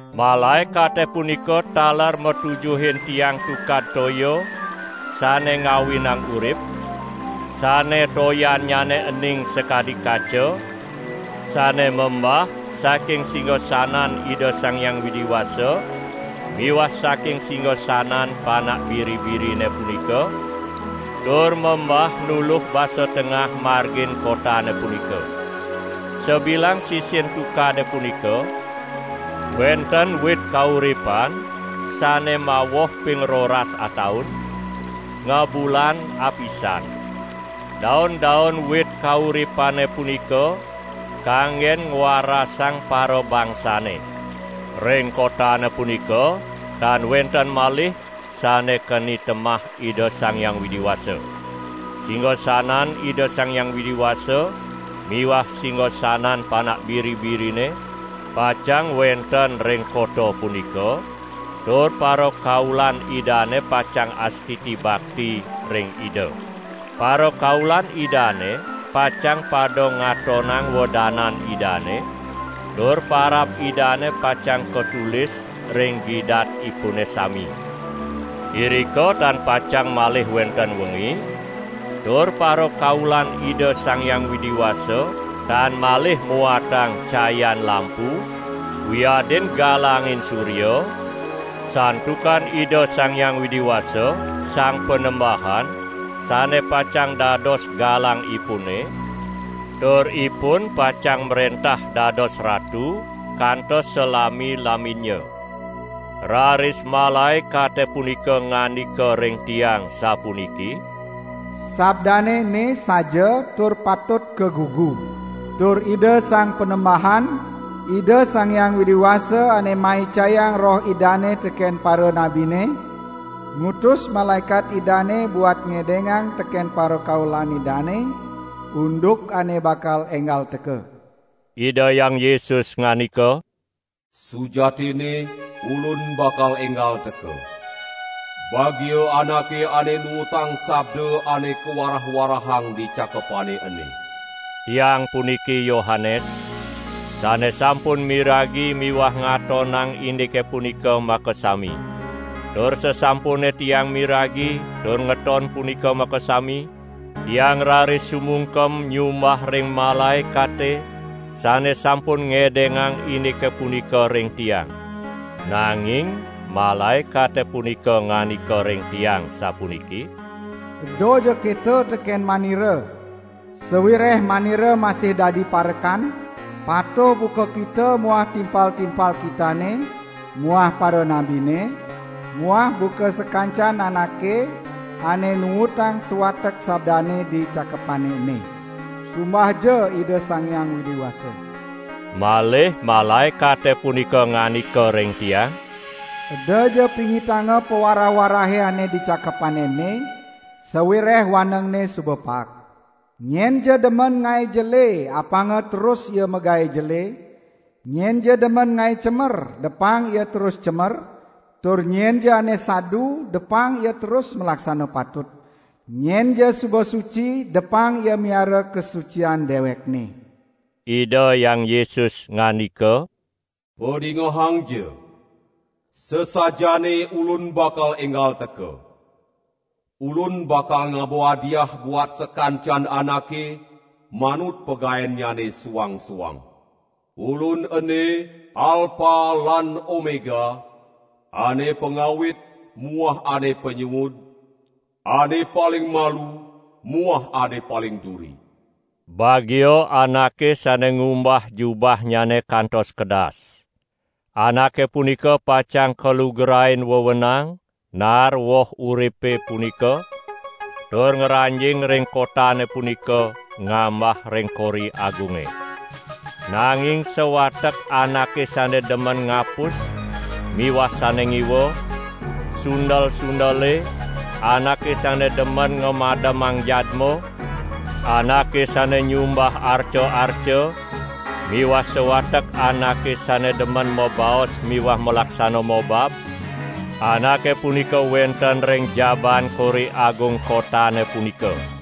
Malaekate punika taler matujuhin tiang tukad toya sane ngawinang urip, sane toyannyane ening sakadi kaca, sane membah saking singasanan Ida Sang Hyang Widi Wasa miwah saking singasanan Panak Biri-birine punika, tur membah nuluh basa tengah margin kotane punika. Sabilang sisin tukade punika, wenten wit kauripan sane mawoh ping roras ataun, ngabulan apisan. Daun-daun wit kauripane punika kanggen ngwarasang parabangsane. Ring kotane punika tan wenten malih sane keni temah Ida Sang Hyang Widi Wasa. Singasanan Ida Sang Hyang Widi Wasa miwah singasanan Panak Biri-birine pacang wenten ring kota punika tur parakaulan Idane pacang astiti bakti ring Ida. Parakaulan Idane pacang pada ngatonang wedanan Idane tur parab Idane pacang katulis ring gidatipune sami. Irika tan pacang malih wenten wengi, tur parakaulan Ida Sang Hyang Widi Wasa tan malih muatang cayan lampu wiadin galanging surya, santukan Ida Sang Hyang Widi Wasa, Sang Panembahan sane pacang dados galangipune, tur ipun pacang mrentah dados ratu kantos salami-laminnya. Raris malaekate punika ngandika ring tiang sapuniki: "Sabdane ene saja tur patut kagugu. Tur Ida Sang Panembahan, Ida Sang Hyang Widi Wasa ane maicayang Roh Idane teken paranabine, ngutus malaekat Idane buat ngedengang teken parakaulan Idane, unduk ane bakal enggal teka." Ida Hyang Yesus ngandika: "Sujatinne Ulun bakal enggal teka! Bagia anake ane nuutang sabda ane kawarah-warahang di cakepane ene!" Tiang puniki Yohanes, sane sampun miragi miwah ngatonang indike punika makasami. Tur sasampune tiang miragi tur ngeton punika makasami, tiang raris sumungkem nyumbah ring malaekate sane sampun ngedengang indike punika ring tiang. Nanging malaekate punika ngandika ring tiang sapuniki: "Edaja keto teken manira! Sawireh manira masih dadi parekan, patuh buka kita muah timpal-timpal kitane muah paranabine muah buka sakancan anake ane nuutang sawatek sabdane di cakepane ene. Sumbahja Ida Sang Hyang Widi Wasa!" Malih malaekate punika ngandika ring tiang: "Edaja pingitanga pawarah-warahe ane di cakepane ene, sawireh wanengne suba paek. Nyenja demen ngae jele apanga terus ia magae jele; nyenja demen ngae cemer depang ia terus cemer, tur nyenja ane sadu depang ia terus malaksana patut; nyenja suba suci depang ia miara kasucian dewekne!" Ida Hyang Yesus ngandika: "Padingehangja! Sasajaane Ulun bakal enggal teka! Ulun bakal ngaba hadiah buat sakancan anake, manut pagaennyane suang-suang. Ulun ene Alpa lan Omega, Ane Pangawit muah Ane Panyuud, Ane Paling Malu muah Ane Paling Duri." Bagia anake sane ngumbah jubahnyane kantos kedas. Anake punika pacang kalugrain wewenang naar woh uripe punika tur ngranjing ring kotane punika ngambah ring kori agunge. Nanging sawatek anake sane demen ngapus miwah sane ngiwa, sundel-sundele, anake sane demen ngamademang jadma, anake sane nyumbah arca-arca miwah sawatek anake sane demen mabaos miwah malaksana mobab, anake punika wenten ring jabaan kori agung kotane punika.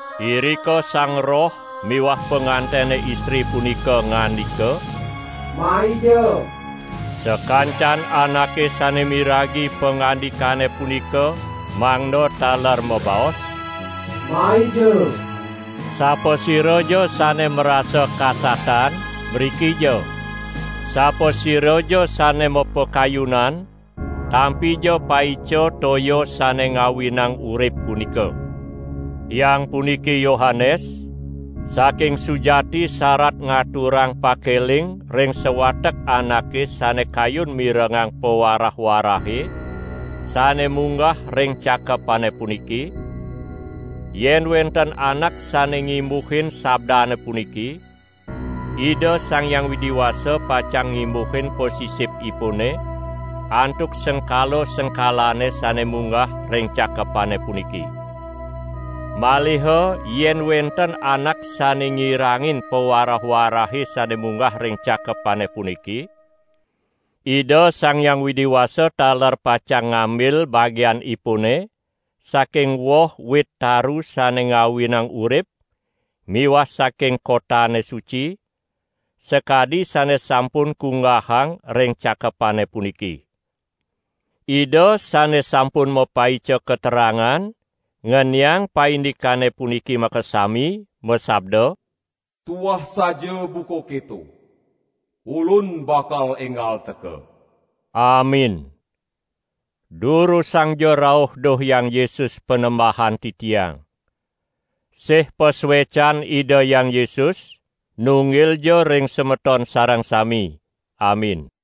Irika Sang Roh miwah pangantene istri punika ngandika: "Maija!" Sakancan anake sane miragi pangandikane punika mangda taler mabaos: "Maija!" Sapasiraja sane marasa kasatan, mrikija; sapasiraja sane mapakayunan, tampija paica toya sane ngawinang urip punika. Tiang puniki Yohanes, saking sujati sarat ngaturang pakeling ring sawatek anake sane kayun mirengang pawarah-warahe sane munggah ring cakepane puniki: "Yen wenten anak sane ngimbuhin sabdane puniki, Ida Sang Hyang Widi Wasa pacang ngimbuhin pasisipipune antuk sengkala-sengkalane sane munggah ring cakepane puniki. Maliha yen wenten anak sane ngirangin pawarah-warahe sane munggah ring cakepane puniki, Ida Sang Hyang Widi Wasa taler pacang ngambil bagianipune saking woh wit taru sane ngawinang urip miwah saking kotane suci, sakadi sane sampun kunggahang ring cakepane puniki." Ida sane sampun mapaica katerangan ngeniang paindikane puniki makasami, masabda: "Tuah saja buka keto! Ulun bakal enggal teka!" Amin. Durusangja rauh duh Hyang Yesus Panembahan titiang! Sih pasuecan Ida Hyang Yesus, nunggilja ring semeton sareng sami! Amin.